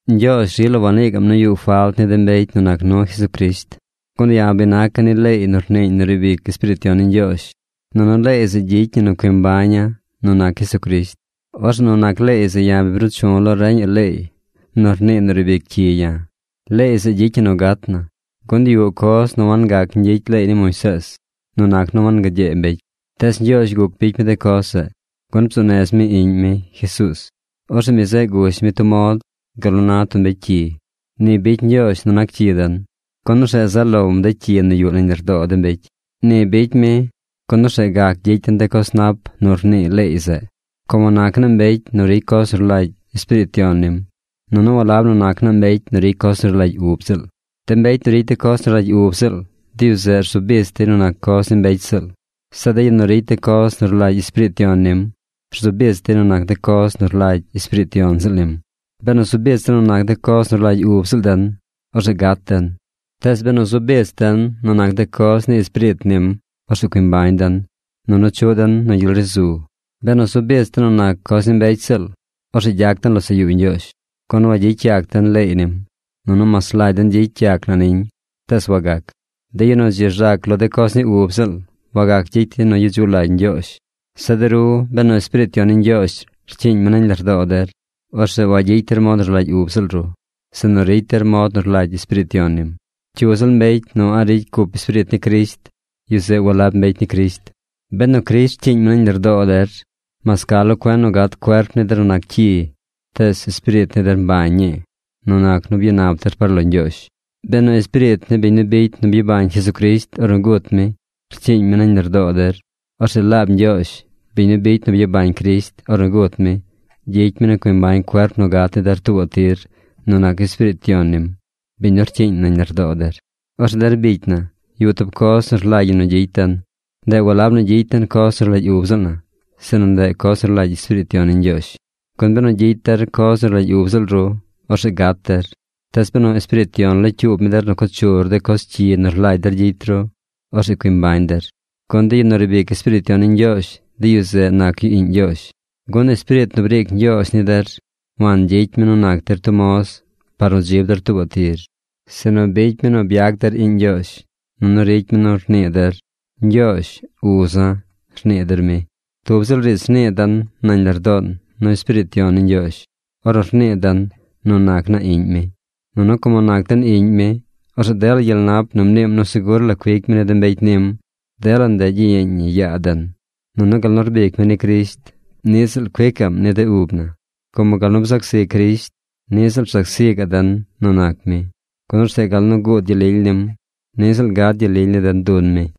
Ñgyoozh rila wanii gaꞌm nu yuꞌ falt ni de mbecy nu nac nu Jesucrisht. Gun ya̱ bi naca̱ ni leey nu rniiñ nu riib ic Espiriit Yon ni Ñgyoozh, nunu leey zeꞌ gyicy ñi nu cui mbaña̱ nu nac Jesucrisht. Orzeꞌ nu nac leey zeꞌ ya̱ bi bruu chu̱ lo reñaꞌ leey nu rnii nu riib ic cyi ya̱. Leey zeꞌ gyicy ñi nu gat na. Gun yuꞌ coz nu wangac ñgyicy leey ni Moisees nu nac nu wangagyee mbecy. Tees Ñgyoozh guc bicy mi de coz zeꞌ, gun bzuu nez mi Iꞌñ mi, Jesuuz. Orzeꞌ mi zeꞌ gush mi tub mod gal nu na tub mbecy cyi. Ni bicy Ñgyoozh nu nac cyi den, gun orzeꞌ zaꞌ lom de cyi nu yuꞌ nañ lardoo de mbecy. Ni bicy mi, gun orzeꞌ gac gyicy den de coz nap nu rnii leey zeꞌ, como nac naa mbecy nu ricy coz nu rlagy Espiriit Yon nim, nunu walab nu nac naa mbecy nu ricy coz nu rlagy ub ziꞌl. De mbecy nu ricy de coz nu rlagy ub ziꞌl, de yu zeꞌ rzu bich dey nu nac coz ni mbecy ziꞌl. Zeꞌ de yu nu ricy de coz nu rlagy Espiriit Yon nim, rzu bich dey nu nac de coz nu rlagy Espiriit Yon ziꞌl nim. Benu zu bich den nu nac de coz nu rlagy ub ziꞌl den, orzeꞌ gat den. Tees benu zu bich den nu nac de coz ni Espiriit nim, orzeꞌ cui mbañ den nunu chuꞌ den nu gyel ri zu. Benu zu bich den nu nac coz ni mbecy ziꞌl, orzeꞌ gyac den losaꞌ yuu Ñgyoozh, gun wagyicy yac den leey nim. Nunu mas rlagy den gyicy yac na niñ tees wagac. De yu nu dzi rzac lo de coz ni ub ziꞌl, wagac gyicy dey nu gyedzuꞌ lagy Ñgyoozh. Zeꞌ de ru benu Espiriit Yon ni Ñgyoozh rcyiiñ mi nañ lardoo der, orzeꞌ wagyicy der mod nu rlagy ub ziꞌl ru, sinu ricy der mod nu rlagy Espiriit Yon nim. Cyu ziꞌl mbecy yu nu a̱ꞌ ricy cup Espiriit ni Crisht, yu zeꞌ walab mbecy ni Crisht. Benu Crisht rcyiiñ mi nañ lardoo der, mas ca lo cuen nu gat cuerp ni der nu nac cyi, tees espiriit ni der mbañ ñii nu nac nu byanap der par lo Ñgyoozh. Benu Espiriit ni biñ nu bicy nu byabañ Jesucrisht ornu gut mi rcyiiñ mi nañ lardoo der, orzeꞌ laab Ñgyoozh, biñ nu bicy nu byabañ Crisht ornu gut mi, gyicy mi nu cui mbañ cuerp nu gat ni der tuubaꞌ tir nu nac Espiriit Yon nim, biñ nu rcyiiñ nañ lardoo der. Orzeꞌ der bicy na, yuꞌ tub coz nu rlagy ñi nu gyicy den. Ndeꞌ walab nu gyicy den coz nu rlagy ub ziꞌl na, sinu ndeꞌ coz nu rlagy Espiriit Yon ni Ñgyoozh. Gun benu gyicy der coz nu rlagy ub ziꞌl ru, orzeꞌ gat der. Tees benu Espiriit Yon locyuub mi der nu co chur de coz cyi nu rlagy der gyicy ru, orzeꞌ cui mbañ der. Gun de yu nu riib ic Espiriit Yon ni Ñgyoozh, de yu zeꞌ nac yu iꞌñ Ñgyoozh. Gun Espiriit nu briic Ñgyoozh ni der wangyicy mi nu nac der tub moz par nu dzib der tuubaꞌ tir, sinu bicy mi nu byac der iꞌñ Ñgyoozh. Nunu ricy mi nu rnii der: “Ñgyoozh, uza̱”, rnii der mi. Tub ziꞌl riidz rnii den nañ lardoon nu Espiriit Yon ni Ñgyoozh ornu rnii den nu nac naa iꞌñ mi. Nunu como nac den iꞌñ mi, orzeꞌ dela gyel nap nu mniim nu segur la cuic mi ni de mbecy nim, dela ndeꞌ gyiyeeñ ñi yaa den. Nunu gal nu rbic mi ni Crisht, niꞌ ziꞌl cuicaꞌm ni de ub na, como gal nu bzac zi Crisht, ni ziꞌl rzac zi gaꞌ den nu nac mi, gun orzeꞌ gal nu guud gyel lily nim, niꞌ ziꞌl gad gyel lily ni den dun mi.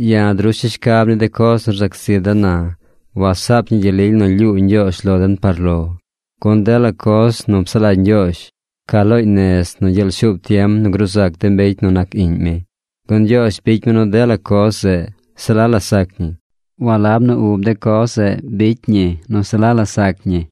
Ya̱ drusha̱ shcab ni de coz nu rzac zi den na wasaap ñi gyel lily nu lyuu Ñgyoozh lo den par lo. Gun dela coz nu psaꞌ lagy Ñgyoozh ca looñ nez nu gyeel shuub tiem nu gruu zac de mbecy nu nac Iꞌñ mi. Gun Ñgyoozh bicy mi nu dela coz zeꞌ, se la la sac ñi. Walab nu ub de coz zeꞌ bicy ñi nu se la la sac ñi,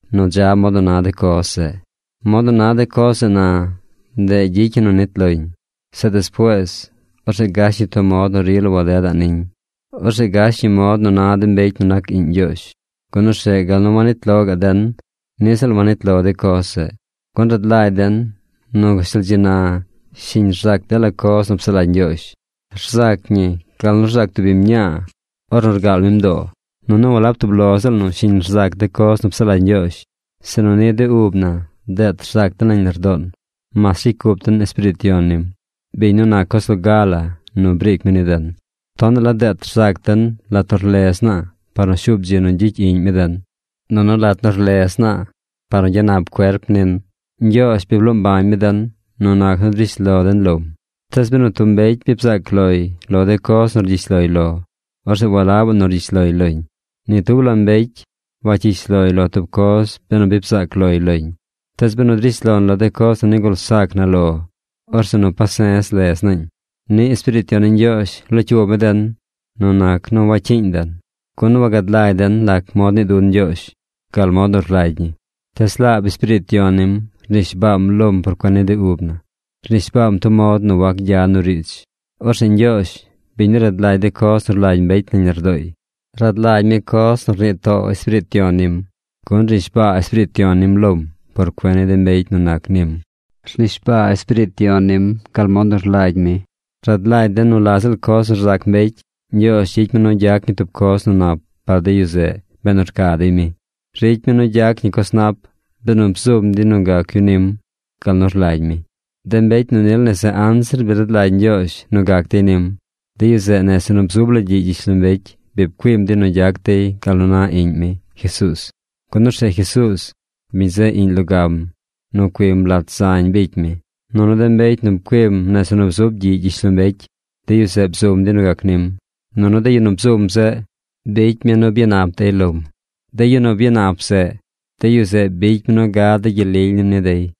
nu dza mod nu na de coz zeꞌ. Mod nu na de coz zeꞌ na, ndeꞌ gyicy ñi nu nit loñ. Zeꞌ despuees, orzeꞌ gash ñi tub mod nu rila wadedaꞌ niñ. Orzeꞌ gash ñi mod nu na de mbecy nu nac Iꞌñ Ñgyoozh, gun orzeꞌ gal nu wanit lo gaꞌ den, niꞌ ziꞌl wanit lo de coz zeꞌ. Gun rad lagy den nu gashtal dzi na shiñ rzac dela coz nu psaꞌ lagy Ñgyoozh. Rzac ñi gal nu rzac tub biñ mñaa ornu rgaal mi mdoo. Nunu walab tub lo ziꞌl nu shiñ rzac de coz nu psaꞌ lagy Ñgyoozh, sinu niꞌ de ub na deet rzac den nañ lardoon mas ricy cup den Espiriit Yon nim, biñ nu nac coz loga la nu briic mi ni den. Tonaꞌ la deet rzac den lat nu rlez naa par nu shuub dzi nu gyicy iꞌñ mi den, nunu lat nu rlez naa par nu gyanap cuerp nin. Ñgyoozh bi bloo mbañ mi den nu nac nu drish lo den lom. Tees benu tub mbecy bi bzaac loy lo de coz nu rgyish loy lo, orzeꞌ walabaꞌ nu rgyish loy loñ. Ni tub la mbecy wacyish loy lo tub coz benu bi bzaac loy loñ. Tees benu drish lon lo de coz nu nigul sac na lo, orzeꞌ nu pase̱z lez naañ. Niꞌ Espiriit Yon ni Ñgyoozh locyuub mi den nu nac nu wacyiiñ den. Gun wagad lagy den lac mod nii dun Ñgyoozh gal mod nu rlagy ñi. Tees laab Espiriit Yon nim rnishbaam lom par cuen ni de ub na. Rnishbaam tub mod nu wac gya nu riidz. Orzeꞌ Ñgyoozh, biñ nu rad lagy de coz nu rlagy mbecy nañ lardooy, rad lagy mi coz nu rnii too Espiriit Yon nim, gun rnishbaa Espiriit Yon nim lom por cuen ni de mbecy nu nac nim. Rnishbaa Espiriit Yon nim gal mod nu rlagy mi. Rad lagy den nu la ziꞌl coz nu rzac mbecy, Ñgyoozh gyicy mi nu gyac ñi tub coz nu nap par de yu zeꞌ benu rca dey mi. Ricy mi nu gyac ñi coz nap benu bzum dey nu gac yu nim gal nu rlagy mi. De mbecy nu nil nese anzir bi rad lagy Ñgyoozh nu gac dey nim, de yu zeꞌ nese nu bzub la gyiꞌ gyishlombecy bi pcuim dey nu gyac dey gal nu na Iꞌñ mi, Jesuuz, gun orzeꞌ Jesuuz, mi zeꞌ Iꞌñ logam nu cuim lat zañ bicy mi. Nunu de mbecy nu pcuim nese nu bzub gyiꞌ gyishlombecy, de yu zeꞌ bzum dey nu gac nim. Nunu de yu nu bzum zeꞌ, bicy mi nu byanap dey lom. De yu nu byanap zeꞌ, de yu zeꞌ bicy mi nu gad de gyel lily nim ni dey.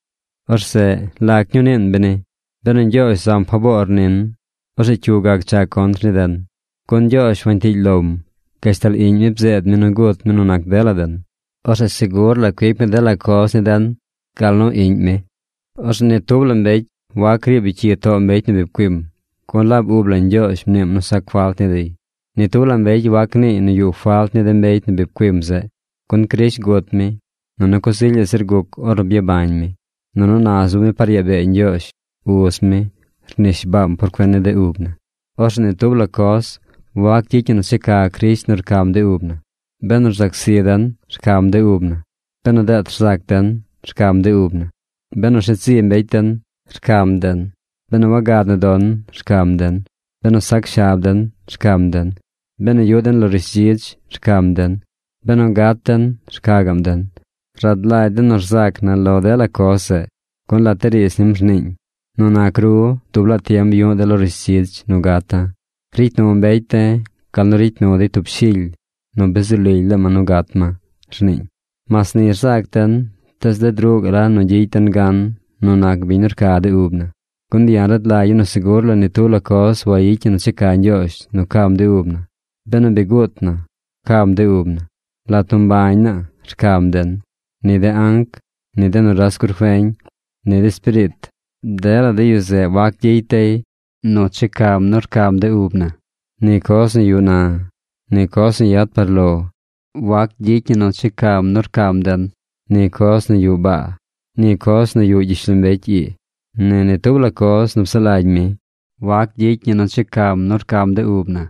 Orzeꞌ ¿lac ñuu niin beni? Benu Ñgyoozh zam faboor nin, orzeꞌ ¿cyu gac cha contr ni den? Gun Ñgyoozh wantiily lom. Gashtal Iꞌñ mi bzeed mi nu gut mi nu nac dela den. Orzeꞌ segur la cuic mi dela coz ni den gal nu Iꞌñ mi. Orzeꞌ ni tub la mbecy wac riib yu cyi too mbecy nu bi pcuim, gun laab ub la Ñgyoozh mniim nu sac falt ni dey. Ni tub la mbecy wac niiy nu yuꞌ falt ni de mbecy nu bi pcuim zeꞌ, gun Crisht gut mi, nunu coz ilyaꞌ zir guc ornu byabañ mi. Nunu na zub mi par yaa bee Ñgyoozh Uz mi rnishbaam por cuen ni de ub na. Orzeꞌ ni tub la coz wac gyicy ñi nu checa Crisht nu rcam de ub na. Benu zac zi den, rcam de ub na. Benu deet rzac den, rcam de ub na. Benu rshet zi mbecy den, rcam den. Benu wagad nu don, rcam den. Benu sac shab den, rcam den. Benu yuꞌ den lo rishdzidz, rcam den. Benu gat den, rca gaꞌm den. Rad lagy den nu rzac na lo dela coz zeꞌ, gun lat de riidz nim rniiñ: Nu nac ru, dub laa tiem yu̱ꞌ de̱ lo rishdzidz nu gata̱. Ricy nu mbecy de̱ gal nu ricy nu dey tub shily nu bi zu lily laa ma nu gat ma, rniiñ. Mas ni rzac den, tees ded ruꞌ gaꞌ la nu gyicy den gan nu nac biñ nu rca de ub na. Gun ya̱ rad lagya̱ nu segur la ni tub la coz wayicy ñi nu checa Ñgyoozh nu cam de ub na. Benu bi guut na, cam de ub na. Lat nu mbañ naa, rcam den. Ni de anc, ni de nuras gurfeñ, ni de espiriit, dela yu zeꞌ wac gyicy dey nu checam nu cam de ub na. Ni coz nu yuꞌ na, ni coz nu yad par lo, wac gyicy ñi nu checam nu cam den. Ni coz nu yuꞌ baa, ni coz yuꞌ gyishlombecy ii, ni ni tub la coz nu psaꞌ lagy mi, wac gyicy ñi nu checam nu cam de ub na.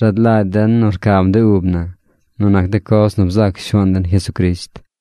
Rad lagy den nu rcam de ub na nu nac de coz nu bzac Shuaan den Jesucrisht.